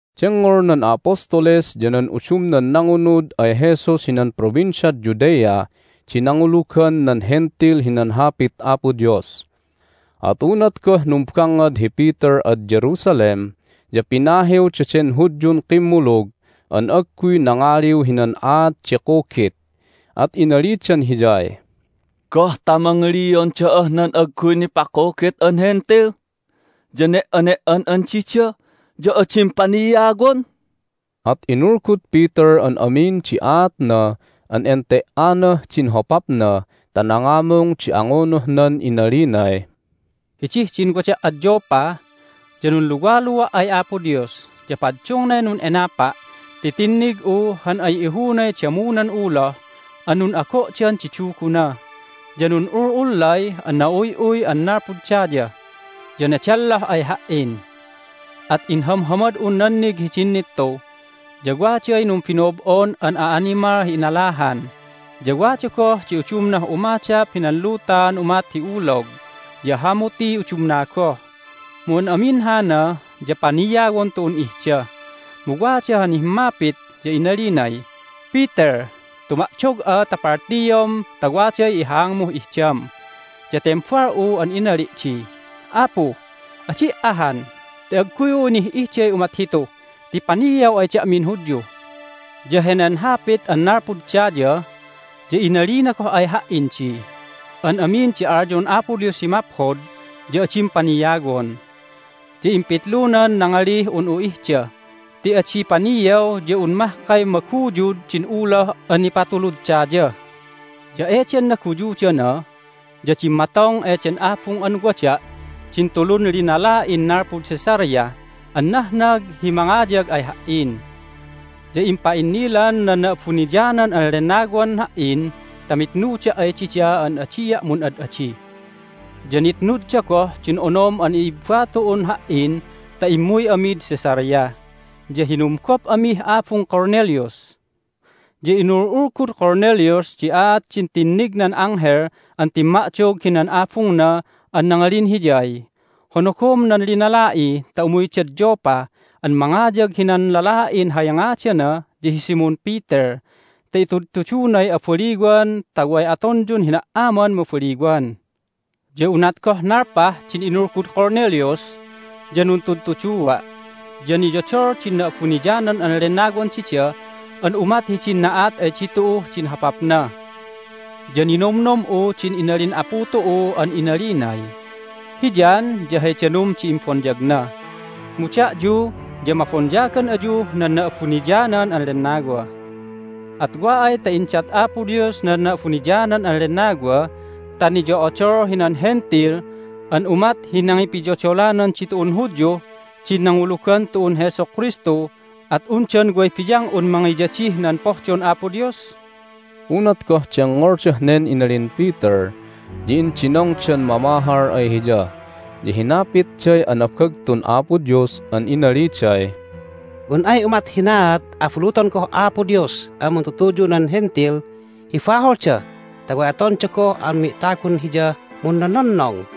Dengngol nan a'apostles ya nan udumnan nangunud ay Jesus hinan Provinciad Judea di nangulugan nan Hentil hinan Hapit Apo Dios. At unat goh numbangngad hi Peter ad Jerusalem ya pinahiw daden Hudyun kimmulug an agguy nangaliw hinan aat di kugit, at inalidan hiyay, "Goh ta mangilion da'ah nan agguy nipakugit an Hentil, ya ne"ane"an'an dida, ya adim paniawon?" At inulgud Peter an amin di aatna an ente"anah din hopapnan ta nangamung di angunuhnan inalinay, "Hidih din wada' ad Joppa ya nunluwalua' ay Apo Dios, ya paddungnay nun'enapa' ti tinnig'u han ay ihunay damunan uloh an nun'ago'dan di duguna, ya nun'ul'ullay an na'uy'uy an nalpud daya, ya nedelloh ay ha"in. At inhamhamad'un nannig hidin nittu, ya waday numbino'ob'on an a'animal hi inalahan, ya wada goh di udumnah umadap hinan luta an umat hi ulog, ya hamutiy udumna goh. Mu an amin hana ya paniawon tu'un ihda. Mu wada han himmapit, ya inalinay, Peter, tumadog'a ta paltiom ta waday ihaangmuh ihdam! Ya tembal'u an inali' di, Apu, adi' ahan! Ti agguy'u inih'ihday umat hitu ti paniaw ay da'min Hudyu! Ya henen hapit an nalpud daya ya inalina goh ay ha"in di, An amin di alyon Apo Dios hi maphod ya adim paniawon. Ya impitlunan nangalih un'u ihda ti adi paniaw ya un mahkay maguyud din uloh an nipatulud daya. Ya eden naguyudana ya dimmatong eden abung an wada' din tulun linala'in nalpud Caesarea an nahnag hi mangayag ay ha"in. Ya impa'innilan nan Na'abuniyanan an Lennawan ha"in ta mitnuda' ay dida an adia' mun'ad'adi. Ya nitnudda goh din onom an i'ibba tu'un ha"in ta immuy amid Caesarea, ya hinumgop amih abung Cornelius. Ya inul'ulgud Cornelius di aat din tinnignan anghel an timma'dog hinan abungna an nangalin hiyay, Honogom nan linala'i ta umuydad Joppa an mangayag hinan lala'in hay ngadana ya hi Simon Peter ta itudtudunay abaliwan ta way atonyun hina"aman mabaliwan. Ya unat goh nalpah din inulgud Cornelius ya nuntudtuduwa', ya niyodol din Na'abuniyanan an Lennawan dida an umat hidin na'at ay ditu'uh din hopapna! Ya ninomnom'u din inalin Apu tu'u an inalinay, Hi John ya hay danum di imbonyagna, mu da'yu ya mabonyagan ayuh nan Na'abuniyanan an Lennawa. At wa ay ta indat Apo Dios nan Na'abuniyanan an Lennawa ta niyo'odol hinan Hentil an umat hi nangipiyodolanan ditu'un Hudyuh din nangulugan tu'un Jesu Kristu at undan way biyang'un mangiyadih nan pohdon Apo Dios?" Unat goh dengngoldah nen inalin Peter ya indinongdan mamahal ay hiya, ya hinapitday anabagtun Apo Dios an inaliday, "Un ay umat hinaat abuluton goh Apo Dios an muntutuyu nan Hentil hi baholda ta way atonda goh an mi'tagun Hiyah munnononnong!"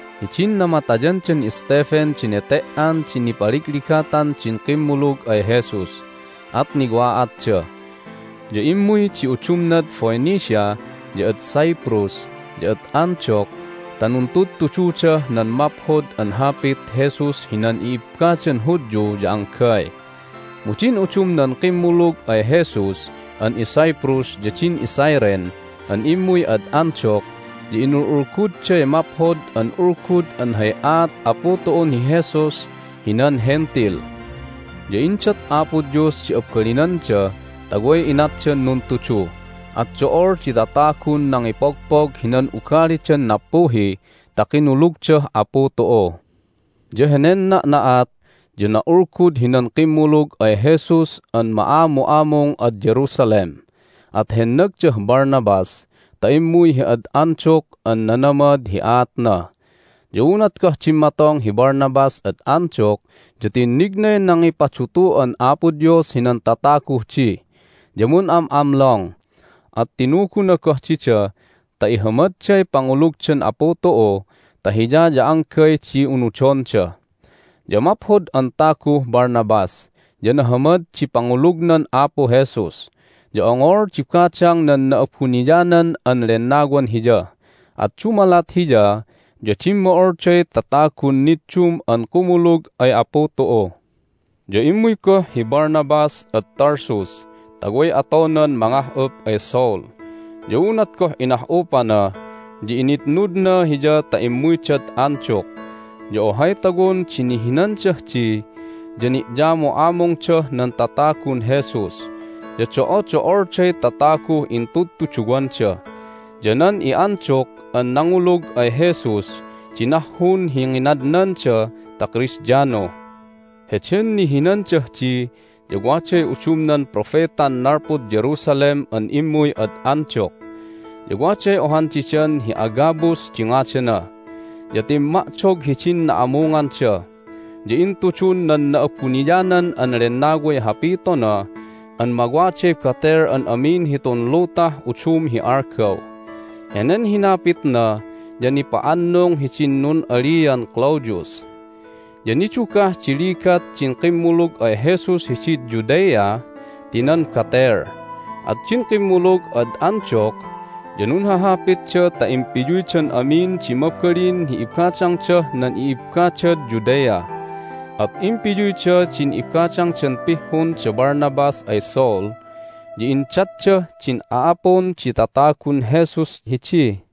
Hidin namatayandan Stephen di nete"an di nipaligligatan din kimmulug ay Jesus, at niwa'atda. Ya immuy di udumnad Phoenicia, ya ad Cyprus, ya ad Antioch ta nuntudtududah nan Maphod an Hapit Jesus hinan i'ibbadan Hudyu ya anggay. Mu din udumnan kimmulug ay Jesus an iCyprus ya din iCyrene an immuy ad Antioch ya inul'ulgudday Maphod an Ulgud an hay aat Apu tu'un hi Jesus hinan Hentil. Ya indat Apo Dios di abalinanda ta way inatdan nuntudu, at do'ol di tatagun nangipogpog hinan ugalidan nappuhi ta kinulugdah Apu tu'u. Ya henen na'na'at ya na'ulgud hinan kimmulug ay Jesus an ma'amu'amung ad Jerusalem, at hennagdah Barnabas ta immuy hi ad Antioch an nanamad hi aatna. Ya unat goh dimmatong hi Barnabas ad Antioch ya tinnignay nangipadutu'an Apo Dios hinan tataguh di. Ya mun'am'amlong, at tinuguna goh dida ta ihamadday pangulugdan Apu tu'u ta Hiya ya anggay di unudonda. Ya maphod an taguh Barnabas, ya nahamad di pangulugnan Apu Jesus, ya ongol di badang nan Na'abuniyanan an Lennawan hiya. At dumalat hiya ya dimmo'olday tatagun niddum an kumulug ay Apu tu'u. Ya immuy goh hi Barnabas ad Tarsus ta way atonan mangah'up ay Saul. Ya unat goh inah'upana ya initnudna hiya ta immuydad Antioch. Ya ohay tawon di nihinandah di, ya ni'yamu'amungdah nan tatagun Jesus, ya do'odo'olday tataguh intudtuduwanda. Ya nan i'Antioch an nangulug ay Jesus di nahhun hi nginadnanda ta Kristiano. Heden nihinandah di ya waday udumnan propetan nalpud Jerusalem an immuy ad Antioch. Ya waday ohan didan hi Agabus di ngadana, ya timma'dog hidin na'amunganda, ya intudun nan Na'abuniyanan an Lennaway hapitona an mawaday batel an amin hitun lutah udum hi algaw. Henen hinapitna ya nipa'annung hidin nun'alian Claudius. Ya nidugah di ligat din kimmulug ay Jesus hidid Judea ti nan batel, at din kimmulug ad Antioch ya nunhahapitda ta impiyuydan amin di mabalin hi ibadangdah nan i'ibbadad Judea. At impiyuyda din ibadangdan pihhun da Barnabas ay Saul, ya indatdah din a'apun di tatagun Jesus hidi.